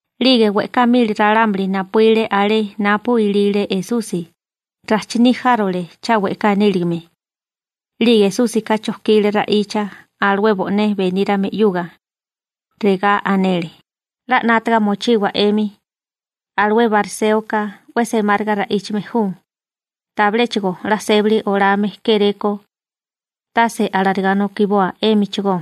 'Lige we'ká mili ralámuli napuíle alé napu ilile Esusi, rajchiní járole cha we'ká níligame. 'Lige Esúsika chojkile ra'icha alué bo'né benírame 'yuga. Regá anele: ―'La 'nátaga mochiwa 'emi, alué bariséoka 'we semáriga ra'íchame ju, tabiléchigo 'la sébali olame kéré ko. Tase alarigá nokiboa 'émichigó,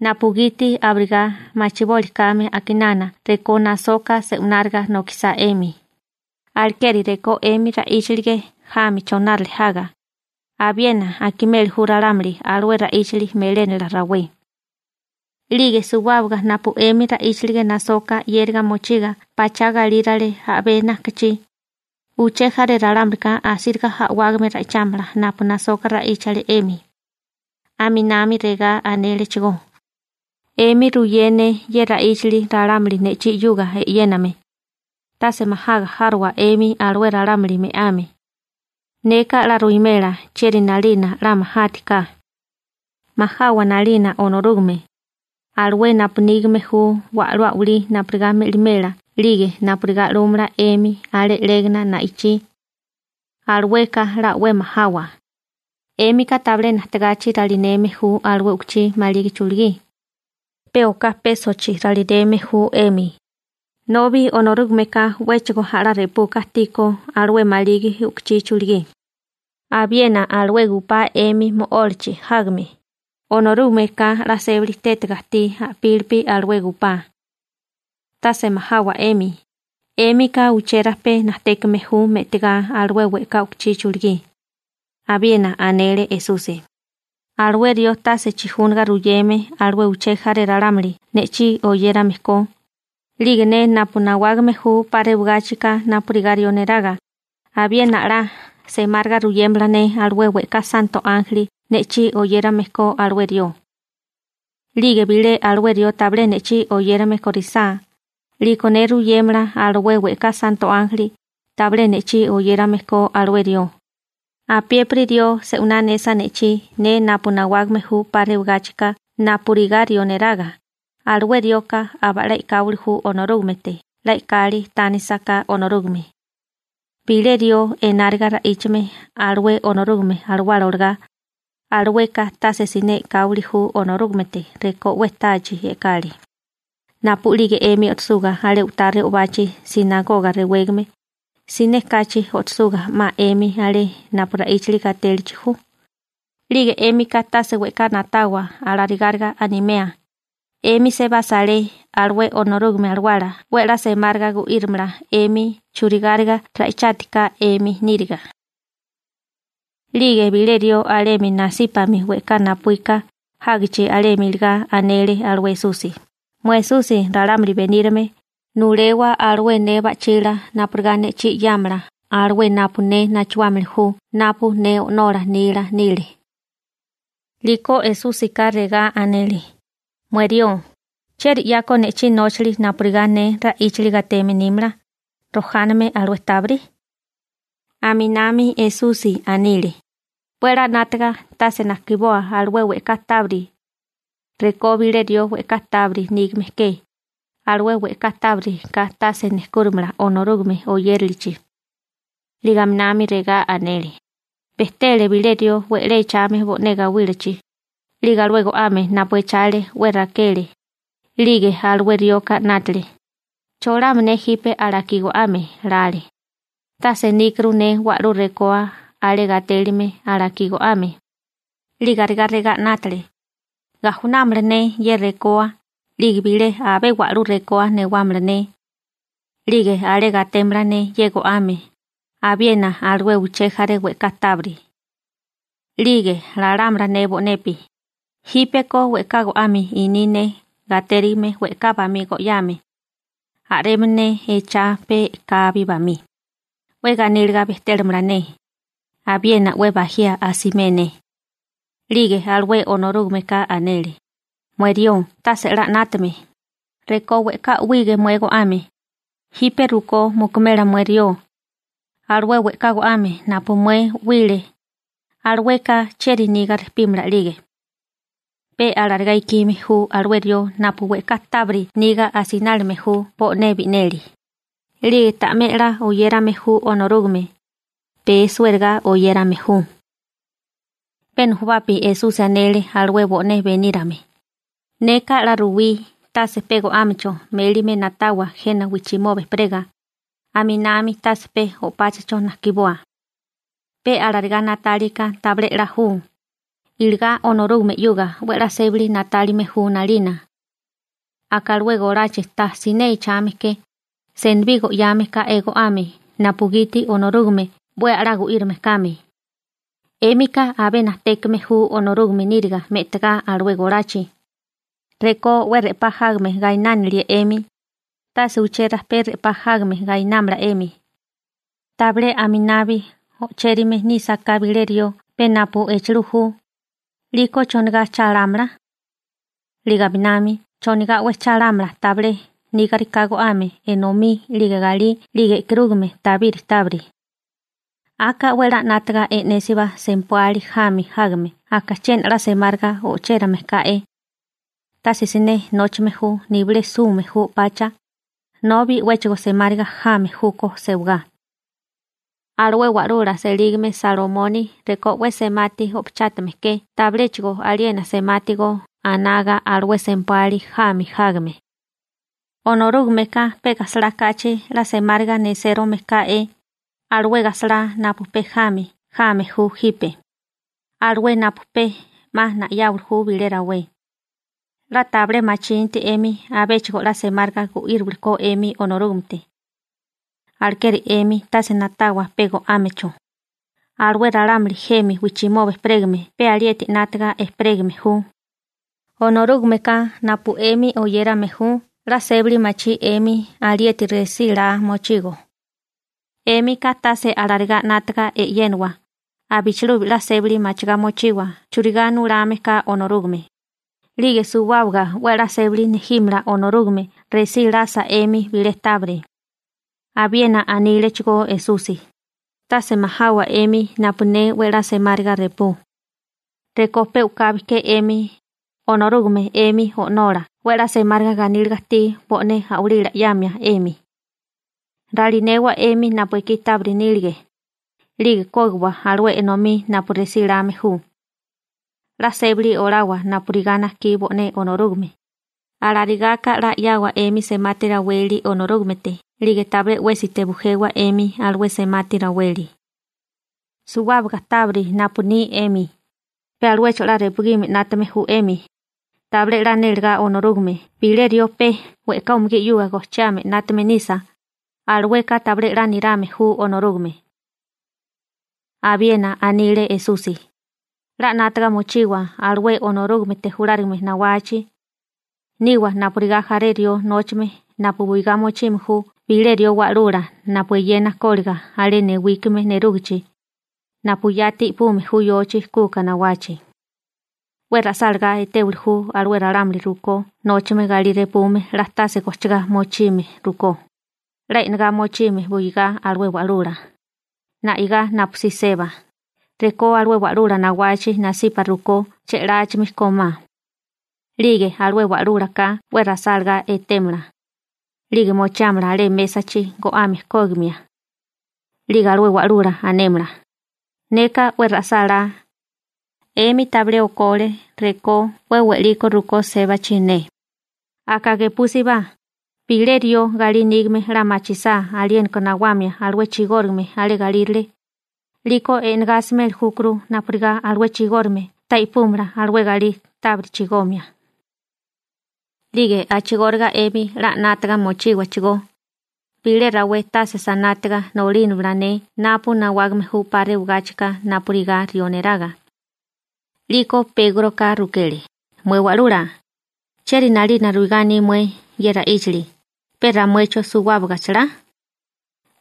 napugiti abirigá machiboli kame a'kinana rekó nasoka se'wináriga nokisá 'emi, alekeri rekó 'emi ra'íchalige jami chonárale jaga, abiena akimeli ju ralámuli alué ra'íchali melénala rawé. 'Lige suwábaga napu 'emi ra'íchalige nasoka 'yériga mochiga pachá galírale a'bé najkachí, uché jaré ralámulika asíriga a'wágame ra'ichámala napu nasoka ra'íchale 'emi. Aminami regá anélechigó: ―'Emi ruyé ne ye ra'íchali ralámuli ne'chí 'yuga e'yéname: tase majaga járowa 'emi alué ralámuli me'ame. Neka 'la ruwimela chieri 'nalina 'la majátiká. Majawa 'nalina Onorúgame, alué napu nígame ju wa'lú a'walí napurigá me'limela 'lige napurigá 'lúmala 'emi alé 'légana na'ichí. Alueka 'la 'we majawa. › 'Émika tabilé najtegachi ralinéame ju alué u'kuchí maligi chulugí, pe oká pésochi ralineme ju 'emi, nobi Onorúgameka 'wéchigo a'lá repuka ajtíkó alué maligi u'kuchí chulugí. Abiena alué gupá 'emi mo'ólachi jágame, Onorúgameka 'la sébali tétega ajtí a'pílipi alué gupá. Tase majawa 'emi, 'émika uché rajpé najtékame ju me'tagá alué we'ká u'kuchí chulugí. Abiena anele Esusi: ―Alué rió tase chijúnaga ruyeme alué uché jaré ralámuli ne'chí oyérame ko, 'lige ne napu nawágame ju 'pa rewagáchika napurigá rió neraga, abiena 'la semáriga ruyémala ne alué we'ká santo ánjeli ne'chí oyérame ko alué rió. 'Lige bilé alué rió tabilé ne'chí oyérame korisá, 'liko ne ruyémala alué we'ká santo ánjeli tabilé ne'chí oyérame ko alué rió. › Apiépiri rió se'winá anesa ne'chí, ne napu nawágame ju 'pa rewagáchika napurigá rió neraga, alué rioka aba'lá e'káwili ju Onorúgamete 'la e'kali tánisaká Onorúgame. Bilé rió enáriga ra'íchame alué Onorúgame Alawala olagá, alueka tase siné e'káwili ju Onorúgamete rekó 'we tachi e'kali. › Napu'lige 'emi o'tosuga alé u'tá re'obachi «sinagoga» rewégame, siné kachi o'tosuga 'ma 'emi alé napu ra'íchali gatélachi ju, 'lige 'émika tase we'ká na'tawa alarigáriga animea, 'emi sebasa alé, alué Onorúgame Alawala 'we a'lá semáriga gu'írimala 'emi churigáriga ra'ichátiká 'emi níriga. 'Lige bilé rió alemi nasípami we'ká napuíka jágichi alemi iligá anele alué Esusi: ―Mué Esusi ralámuli benírame, nulewa alué ne ba'chila napurigá ne'chí 'yámala alué napu ne nachuámili ju napu ne o'nola nila nile. 'Liko Esúsika regá anele: ―Mué rió, ¿chieri 'ya ko ne'chí nóchali napurigá ne ra'íchali gateme nímala, rojáname alué tábiri? Aminami Esusi anile: ―'We a'lá 'nátaga, tase najkiboa alué we'ká tábiri. Rekó bilé rió we'ká tábiri nígame ke, alué we'ká tábiri ka tase nejkúrimala Onorúgame oyérilichi. 'Lige aminami regá anele: ―Bejtele bilé rió we'lé echame bo'né gawílachi, 'lige alué go'ame napu echale 'we rakele. 'Lige alué rioka 'nátale: «¿Cholama ne jipe alakí go'ame?» lale. «Tase níkuru ne wa'lú rekoa alé gatélime alakí go'ame.» 'Lige arigá regá 'nátale: «Gajunámala ne ye rekoa, 'lige bilé abé wa'lú rekoa newámala ne. 'Lige alé gatémala ne ye go'ame, abiena alué uché jaré we'ká tábiri.» 'Lige lámala ne bo'nepi: «Jípeko we'ká go'ame iní ne gatérigime we'ká bamí go'yáame. A'rema ne echá pe'kabi bamí, 'we ganíliga bejtémala ne, abiena 'we bajía asimé ne.» › 'Lige alué Onorúgameka anele: «Mué rió tase 'la 'nátame, rekó we'ká 'wige mué go'ame, jipe rukó mukumela mué rió. Alué we'ká go'ame napu mué 'wile, alueka ¿chieri niga rejpímala 'lige?» › Pe alarigá ikime ju alué rió napu we'ká tábiri niga asinálime ju bo'né bi'neli, 'lige ta'mé 'la oyérame ju Onorúgame, pee suériga oyérame ju. Pe nujubapi Esusi anele alué bo'né benírame: ―Neka 'la ruwí: Tase pe go'ámecho mélime na'tawa jena wijchimoba ejperega, aminami tase pe o'páchacho najkiboa. Pe alarigá na'tálika tabilé 'la ju, iligá Onorúgame 'yuga 'we a'lá sébali na'tálime ju 'nalina. Aka alué golachi ta siné echame ke, senibí go'yame ká'é go'ame napugiti Onorúgame 'we a'lá gu'írame kame. ¡'Émika abé najtékame ju Onorúgame níriga me'tagá alué golachi! Rekó 'we re'pá jágame gainánilie 'emi, tase uché rajpé re'pá jágame gainámala 'emi. Tabilé aminabi ochérame nísaká bilé rió pe napu echilú ju, 'liko ¿chonigá cha lámala? 'Lige aminami ¿chonigá 'we cha lámala tabilé nígariká go'ame, enomí 'lige galí, 'lige e'karúgame tabiri tábiri? › Aka 'we 'la 'nátaga e'nésibá Sempuali jami jágame aka chiena 'la semáriga o'chérame ká'é. Tase siné nóchame ju nibilé sume ju o'pacha, nobi 'wéchigo semáriga jame júkó sewagá. Alué wa'lula selígame Salomoni rekó 'we semati o'pachátame ke tabiléchigo aliena semati go anaga alué Sempuali jami jágame. Onorúgameka pe gajsalá kachi 'la semáriga nesérome ká'é, alué gajsalá napu pe jami jame ju jipe, alué napu pe 'ma na'yáwili ju bilé rawé. 'La tabilé machinti 'emi abéchigo 'la semáriga gu'íriwili ko 'emi Onorúgamete. Alekeri 'emi tase na'tawa pe go'ámecho. Alué ralámuli jemi wijchimoba ejperégame pe alieti 'nátaga ejperégame ju. Onorúgameka napu 'emi oyérame ju 'la sébali machí 'emi alieti resí laa mochigo. 'Émika tase alarigá 'nátaga e'yénawa, abichilubi 'la sébali machigá mochiwa churigá nulame ka Onorúgame, 'lige suwábaga 'we a'lá sébali nejímala Onorúgame resí lasa 'emi bilé tábiri. Abiena anílechigó Esusi: ―Tase majawa 'emi napu ne 'we a'lá semáriga repú. Rekó pe u'kabi ke 'emi, Onorúgame 'emi O'nola 'we a'lá semáriga ganíliga ajtí bo'né a'walila 'yamia 'emi. Ralinewa 'emi napu ekí tábiri nílige, 'lige kógiwa alué enomí napu resí lame ju. 'La sébali olawa napurigá najkí bo'né Onorúgame, alarigaka 'la 'yawa 'emi semati raweli Onorúgamete 'lige tabilé 'wésite bujewa 'emi alué semati raweli. Suwábaga tábiri napu ni 'emi, pe aluecho 'la repugime 'nátame ju 'emi, tabilé 'la nélegá Onorúgame bilé rió pe we'ká umugí 'yuga gojchiame 'nátame nisa, alueka tabilé 'la nirame ju Onorúgame. Abiena anile Esusi: ―'La 'nátaga mochiwa alué Onorúgamete julárigame nawachi. Niwa napurigá jaré rió nóchame napu buigá mochime ju bilé rió wa'lula napu eyena kóliga alé newíkime nerúgichi, napu yati i'pume ju yochi kuka nawachi. 'We ra'sálagá etéwili ju alué ralámuli rukó nóchame galí repume 'la tase gojchigá mochime rukó, 'la e'negá mochime buigá alué wa'lula, na'igá napusí seba, rekó alué wa'lula nawachi nasipa rukó che'láchimi kómá. 'Lige alué wa'lúlaka 'we ra'sálagá etémala, 'lige mochiámala alé mésachi go'ame kógimia. 'Lige alué wa'lula anémala «Neka 'we ra'sálá. 'Emi tabilé okole rekó 'we we'liko rukó sébachi ne.» › Aka gepúsibá: Bilé rió galí nígame 'la machisá aliéniko nawamia alué chigórigame alé galírale, 'liko e'negá asimeli júkuru napurigá alué chigórigame ta i'púmala alué galí tábiri chigomia. 'Lige a'chigóriga 'emi 'la 'nátaga mochíwachigó. Bilé rawé tase sanátiga nolínamala ne napu nawágame ju 'pa rewagáchika napurigá rió neraga. 'Liko Pégroka rukele: ―Mué Wa'lula, ¿chieri 'nalina ruigá aní mué ye ra'íchali? ¿Pe ramuecho, suwábaga chalá?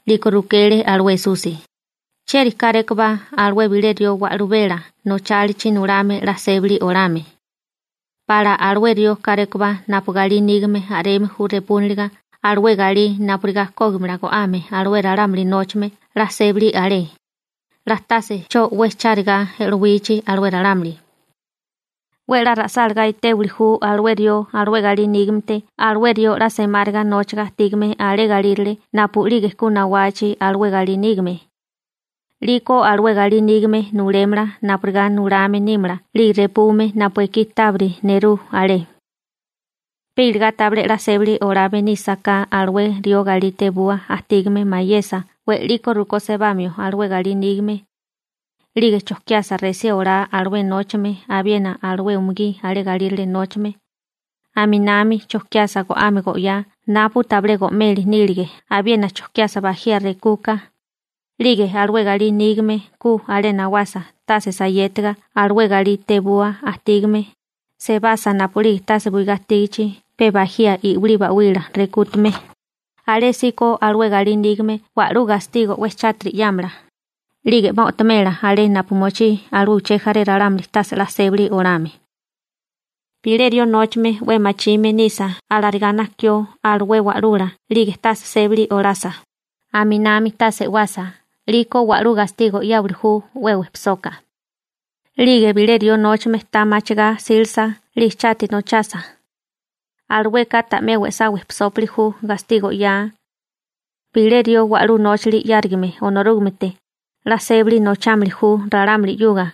'Liko rukele alué Esusi: ―¿Chieri kárékobá alué bilé rió wa'lubela nóchalichi nulame 'la sébali olame? ¿Pala alué rió kárékobá napu galí nígame a'reme ju repúniliga alué galí napurigá kógimala go'ame alué ralámuli nóchame 'la sébali alé, 'la tase 'cho 'we charigá e'lowichi alué ralámuli? 'We 'la ra'sálagá etéwili ju alué rió alué galí nígamete alué rió 'la semáriga nóchaga ajtígame alé galírale napu'lige ku nawachi alué galí nígame. 'Liko alué galí nígame nulémala napurigá nulame nímala 'lige repume napu ekí tábiri nerú alé. Pe iligá tabilé 'la sébali olame nísaká alué rió galí tebua ajtígame mayesa we'liko sebamio alué galí nígame, 'lige chojkiasa resí olá alué nóchame abiena alué umugí alé galírale nóchame, aminami chojkiasa go'ame go'yá napu tabilé go'meli nílige abiena chokiasa bajía rekuka, 'lige alué galí nígame ku alé nawasa tase sayétiga alué galí tebua ajtígame, sebasa napu'lige tase buigá ajtígichi pe bajía i'wilí ba'wila rekútame, alésíko alué galí nígame wa'lú gastigo 'we chátiri 'yámala, 'lige 'ma o'tomela alé napu mochí alué uché jaré ralámuli tase 'la sébali olame. › Bilé rió nóchame 'we machime nisa alarigá najkió alué wa'lula 'lige tase sébali olasa, aminami tase e'wasa, 'liko wa'lú gastigo 'yáwili ju 'we wejpisoka. 'Lige bilé rió nóchame ta machigá 'sílasa 'lige chati nochasa, alueka ta'mé we'sá wejpisópili ju gastigo 'yaa. Bilé rió wa'lú nóchali 'yárigame Onorúgamete, 'la sébali nochámili ju ralámuli 'yuga.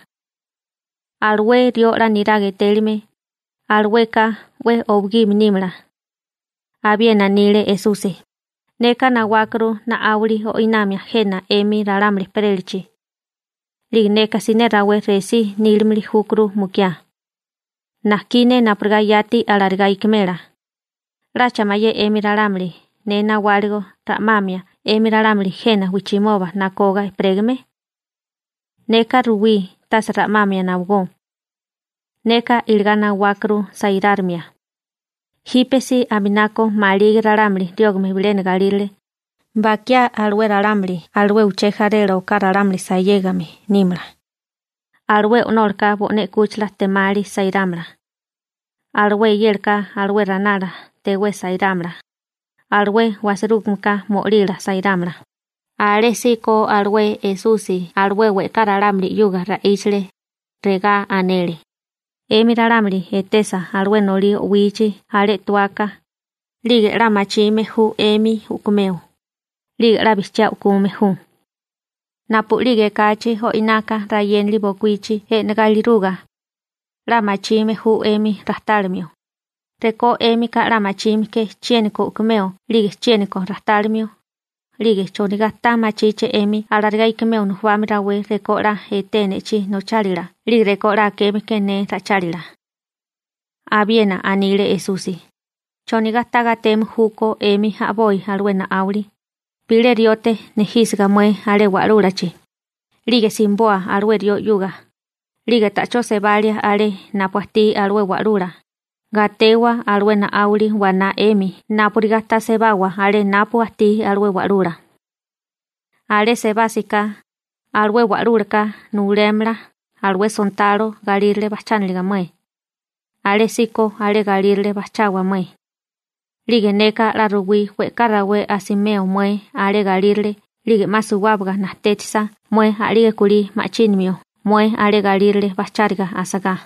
Alué rió 'la niraga etélime, alueka 'we owigime nímala. Abiena anile Esusi: ―Neka nawákuru na'áwali o'inamia jena 'emi ralámuli ejperélachi. 'Lige neka siné rawé resí nílimili júkuru mukiá. Najkí ne napurigá yati alarigá ikimela. ¿'Lacha mayé 'emi ralámuli ne nawáligo ra'mamia 'emi ralámuli jena wijchimoba nakoga ejperégame? Neka ruwí tase ra'mamia nawagó. Neka iligá nawákuru sairárimia. Jipe si aminako maligi ralámuli riógame bilena galírale, bakiá alué ralámuli alué uché jarela oká ralámuli sayégame nímala. Alué o'nólaka bo'né 'kúchila ejtemali sairámala. Alué eyélaka alué ranala tewé sairámala. Alué wasirúgameka mo'lila sairámala. Alésíko alué Esusi alué we'ká ralámuli 'yuga ra'íchale, regá anele: ―'Emi ralámuli etesa alué nolí o'wichi alé tuaka, 'lige 'la machime ju 'emi u'kumeo, 'lige 'la bijchiá u'kume ju. Napu'lige ekachi o'inaka rayénali bokuíchi e'negá iliruga, 'la machime ju 'emi rajtálimio. Rekó 'émika 'la machime ke chiéniko u'kumeo 'lige chiéniko rajtálimio, 'lige ¿chonigá ta machíché 'emi alarigá ikimeo nujubami rawé rekó 'la etee ne'chí nochálila 'lige rekó 'la akéeme ke ne ra'ichálila? Abiena anile Esusi: ―¿Chonigá ta gateme júkó 'emi a'boi alué na'áwali? Bilé riote nejísiga mué alé wa'lúlachi, 'lige simiboa alué rió 'yuga, 'lige ta'chó sebalia alé napu ajtí alué wa'lula, gatewa alué na'áwali waná 'emi napurigá ta sebawa alé napu ajtí alué wa'lula. Alé sebásiká, alué wa'lúlaka nulémala alué sontalo galírale bajchániliga mué. Alésíko alé galírale bajchawa mué. 'Lige neka 'la ruwí we'ká rawé asimeo mué alé galírale 'lige 'ma suwábaga najtétisa mué a'lige kulí ma'chínimio mué alé galírale bajcháriga asagá.